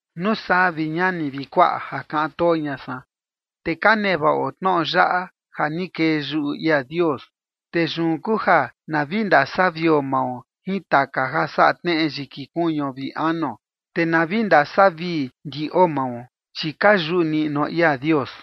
Nuu saa, vi ñani vi kuaꞌa ja kaꞌan too ña san, te ka nevaꞌo tnoꞌo yaꞌa ja ni kee yuꞌu ia Dios. Te yun kuu ja na vi ndasavio mao jin taka ja saꞌa tneꞌe yiki kuñuo vi anuo, te na vi ndasavii ndiꞌo mao, chi ka yuꞌu niꞌnuo ia Dios.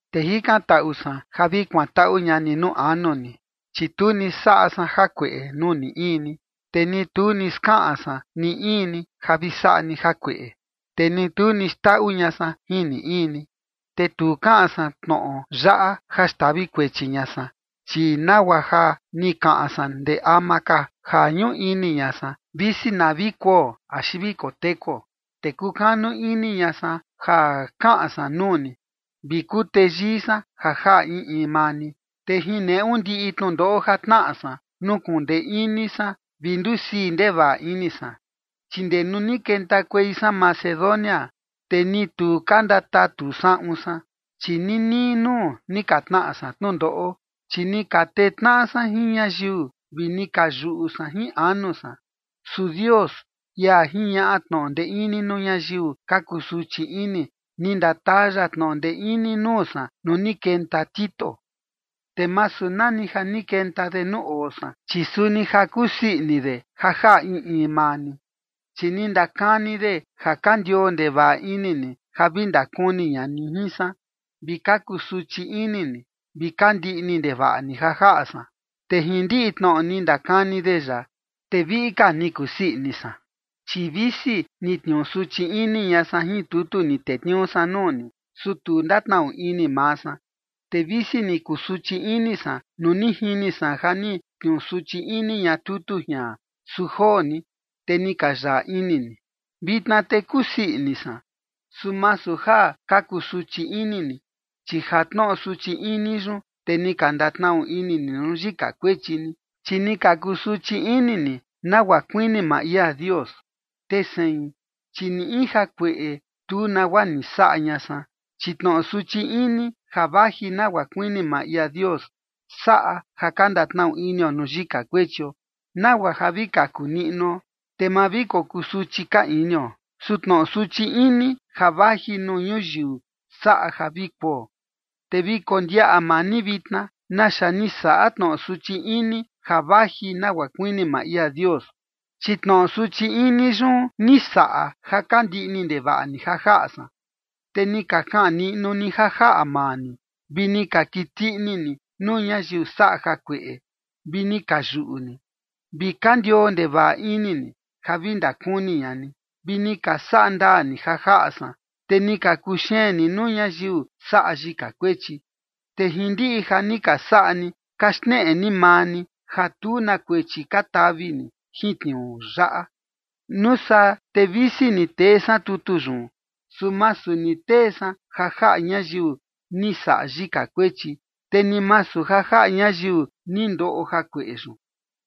Te jikantaꞌu san ja vi kuantaꞌu ña ni nuu anu ni, chi tu ni saꞌa san jakueꞌe nuu ni in ni, te ni tu ni skaꞌan san ni in ni ja vi saꞌa ni jakueꞌe, te ni tu ni xndaꞌu ña san jin ni in ni. Te tu kaꞌan san tnoꞌo yaꞌa ja xtavi kuechi ña san, chi nagua ja ni kaꞌan san ndee ama ka, ja ñuꞌu ini ña san, visi na vi kuo axi vi kotekuo. Te kukanu ini ña san ja kaꞌan san nuu ni, vi kuteyii san ja jaꞌa in in maa ni. Te jin neꞌu ndiꞌi tnundoꞌo ja tnaꞌa san, nukuꞌun ndee ini san vi ndusii ndevaꞌa ini san. Chi ndee nuu ni kentakuei san Macedonia, te ni tu ka ndatatu saꞌun san, chi ninii nuu ni ka tnaꞌa san tnundoꞌo, chi ni ka tee tnaꞌa san jin ñayiu vi ni ka yuꞌu san jin anu san. Su Dios, ia jiñaꞌa tnoꞌo ndee ini nuu ñayiu ka kusuchi ini, ni ndataa ya tnoꞌo ndee ini nuu san nuu ni kenta Tito. Te masu nani ja ni kenta de nuu oo san, chi suni ja kusii ini de ja jaꞌa in in maa ni. Chi ni ndakani de ja ka ndioo ndevaꞌa ini ni ja vi ndakuni ña ni jin san, vi ka kusuchi ini ni, vi ka ndiꞌni ndevaꞌa ni ja jaꞌa san. Te jin ndiꞌi tnoꞌo ni ndakani de yaꞌa, te viꞌi ka ni kusii ini san. Chi visi ni tniuu suchi ini ña san jin tutu ni tetniuu san nuu ni, su tu ndatnaꞌu ini maa san. Te visi ni kusuchi ini san nuu ni jini san ja ni tniuu suchi ini ña tutu jian, su joo ni, te ni ka yaꞌa ini ni. Vitna te kusii ini san, su masu ja ka kusuchi ini ni, chi ja tnoꞌo suchi ini yun, te ni ka ndatnaꞌu ini ni nuu yika kuechi ni, chi ni ka kusuchi ini ni, nagua kuini maa ia Dios. Te sein, chi ni in jakueꞌe, tu nagua ni saꞌa ña san. Chi tnoꞌo suchi ini ja vaji nagua kuini maa ia Dios, saꞌa ja ka ndatnaꞌu inio nuu yika kuechio, nagua ja vi kaku niꞌnuo, te ma vi kokusuchi ka inio. Su tnoꞌo suchi ini ja vaji nuu ñuyiu saꞌa ja vi kuo. Te vi kondiaꞌa maa ni vitna, naxa ni saꞌa tnoꞌo suchi ini ja vaji nagua kuini maa ia Dios. Chi tnoꞌo suchi ini yun ni saꞌa ja ka ndiꞌni ndevaꞌa ni ja jaꞌa san, te ni ka kaꞌan niꞌnu ni ja jaꞌa maa ni, vi ni ka kiti ini ni nuu ñayiu saꞌa jakueꞌe, vi ni ka yuꞌu ni, vi ka ndioo ndevaꞌa ini ni ja vi ndakuni ña ni, vi ni ka saꞌa ndaa ni ja jaꞌa san, te ni ka kuxeen ni nuu ñayiu saꞌa yika kuechi. Te jin ndiꞌi ja ni ka saꞌa ni, ka xneꞌe ni maa ni ja tu na kuechi ka tavi ni jin tniuu yaꞌa. Nuu saa te visi ni tee san tutu yun, su masu ni tee san ja jaꞌa ñayiu ni saꞌa yika kuechi, te ni masu ja jaꞌa ñayiu ni ndoꞌo jakueꞌe yun.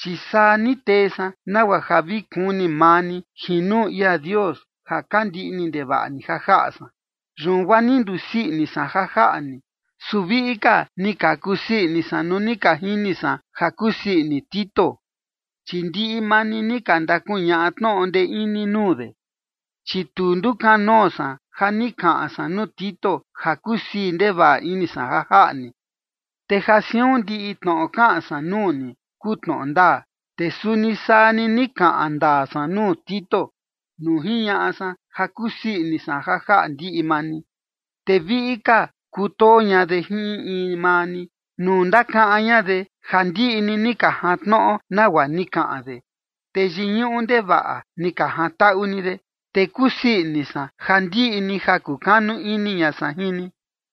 Chi saa ni tee san nagua ja vi kuni maa ni jin nuu ia Dios ja ka ndiꞌni ndevaꞌa ni ja jaꞌa san. Yun guaa ni ndusii ini san ja jaꞌa ni. Su viꞌi ka ni ka kusii ini san nuu ni ka jini san ja kusii ini Tito, chi ndiꞌi maa ni ni ka ndakuñaꞌa tnoꞌo ndee ini nuu de. Chi tu ndukanoo san ja ni kaꞌan san nuu Tito ja kusii ndevaꞌa ini san ja jaꞌa ni. Te ja siun ndiꞌi tnoꞌo kaꞌan san nuu ni kuu tnoꞌo ndaa, te suni saa ni ni kaꞌan ndaa san nuu Tito nuu jiñaꞌa san ja kusii ini san ja jaꞌa ndiꞌi maa ni. Te viꞌi ka kutoo ña de jin in in maa ni, nuu ndakaꞌan ña de ja ndiꞌi ni ni ka jantnoꞌo nagua ni kaꞌan de, te yiñuꞌu ndevaꞌa ni ka jantaꞌu ni de. Te kusii ini san ja ndiꞌi ni ja kukanu ini ña san jin ni.